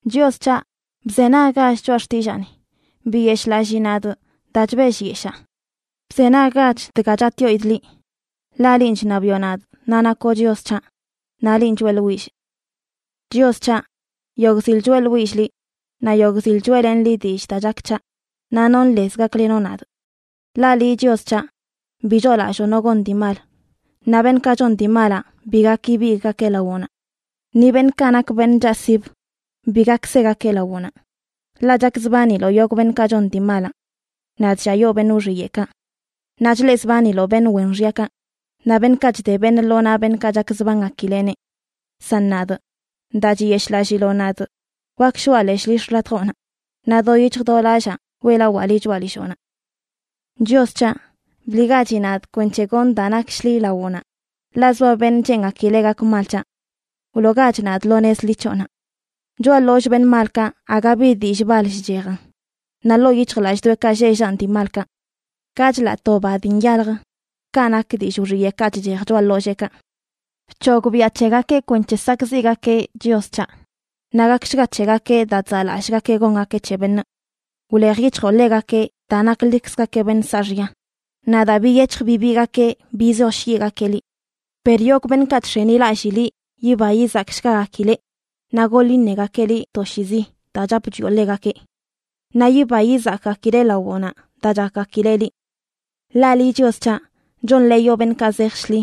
Chios c̱haꞌ, bzenaggach choꞌa xtillaani. Biyeshꞌlallii nadꞌ daa chbellyeshaa. Bzenaggach dga chatꞌyoidꞌ liꞌ, ḻaꞌ linꞌ chṉabiꞌo nadꞌ naꞌ nakoꞌ Chios c̱haꞌ, naꞌ linꞌ choeꞌḻwillꞌ. Chios c̱haꞌ, yogꞌ zil choeꞌḻwillꞌ liꞌ, naꞌ yogꞌ zil choeꞌlenꞌ liꞌ dillꞌ daa chak c̱haꞌ, naꞌ nonꞌ lez gaklenoꞌ nadꞌ. Ḻaꞌ liꞌ, Chios c̱haꞌ, bi choolalloo no gon dii mal, naꞌ beṉꞌkaꞌ chon dii malaꞌ bi gak ibigꞌgakeꞌ lawoꞌnaꞌ. Ni beṉꞌkaꞌ nak beṉꞌ chaꞌsibə bi gak segakeꞌ lawoꞌnaꞌ, ḻaꞌ chakzbaniloꞌ yogꞌ beṉꞌkaꞌ chon dii malaꞌ. Naꞌ chlliayoo beṉꞌ wxiyeꞌkaꞌ. Naꞌ chleꞌzbaniloꞌ beṉꞌ wen xyakaꞌ, naꞌ beṉꞌkaꞌ chde beṉꞌ lo naꞌ beṉꞌkaꞌ chakzbangakileꞌneꞌ. San nadꞌ, daa chiyeshꞌlalliloꞌ nadꞌ, wak shoꞌa leshꞌ lill xḻatjoꞌnaꞌ, naꞌ do yic̱hj do lallaa weꞌlawaa liꞌ choꞌa lilloꞌnaꞌ. Chios c̱haꞌ, bliꞌgachi nadꞌ kwenc̱he gonꞌ daa nak shḻi lawoꞌnaꞌ, ḻaꞌ zoa beṉꞌ cheengakileꞌ gak mal c̱haꞌ. Wloogach nadꞌ lo nez ḻi c̱hoꞌnaꞌ. Choꞌa ḻollꞌ beṉꞌ malkaꞌ aga bi dillꞌ bal chchejan, naꞌ ḻoo yic̱hjlallꞌdoꞌekaꞌ lleꞌ llanꞌ dii malkaꞌ. Ka chḻaꞌ to ba dii nyaljə kaꞌ nak dillꞌ wxiyeꞌkaꞌ chchej choꞌa ḻolleekaꞌ. ¡Bc̱hogbiaꞌ c̱hegakeꞌ kwenc̱he sakꞌziꞌgakeꞌ, Chios c̱haꞌ! Naꞌ gakshga c̱hegakeꞌ daa chzaꞌlallꞌgakeꞌ gongakeꞌ c̱he beṉꞌ. Wlej yic̱hjoꞌ ḻegakeꞌ daa naklikzgakeꞌ beṉꞌ saaxya, naꞌ daa biyec̱hj bibiigakeꞌ bizoshyiꞌgakeꞌ liꞌ. Per yogꞌ beṉꞌkaꞌ chx̱enilallꞌ liꞌ yiba yizakshgagakileꞌ, naꞌ goḻ iṉegakeꞌ liꞌ toshiizi daa chap chwioꞌ ḻegakeꞌ. Naꞌ yiba yizakgakileꞌ lawoꞌnaꞌ daa chakgakileꞌ liꞌ. Ḻaꞌ liꞌ, Chios c̱haꞌ, chonḻeeyoꞌ beṉꞌkaꞌ zej shḻi.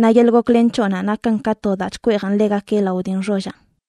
Naꞌ yeḻꞌ goklen c̱hoꞌnaꞌ nakan ka to daa chkweejan ḻegakeꞌ lao dii nxollaꞌ.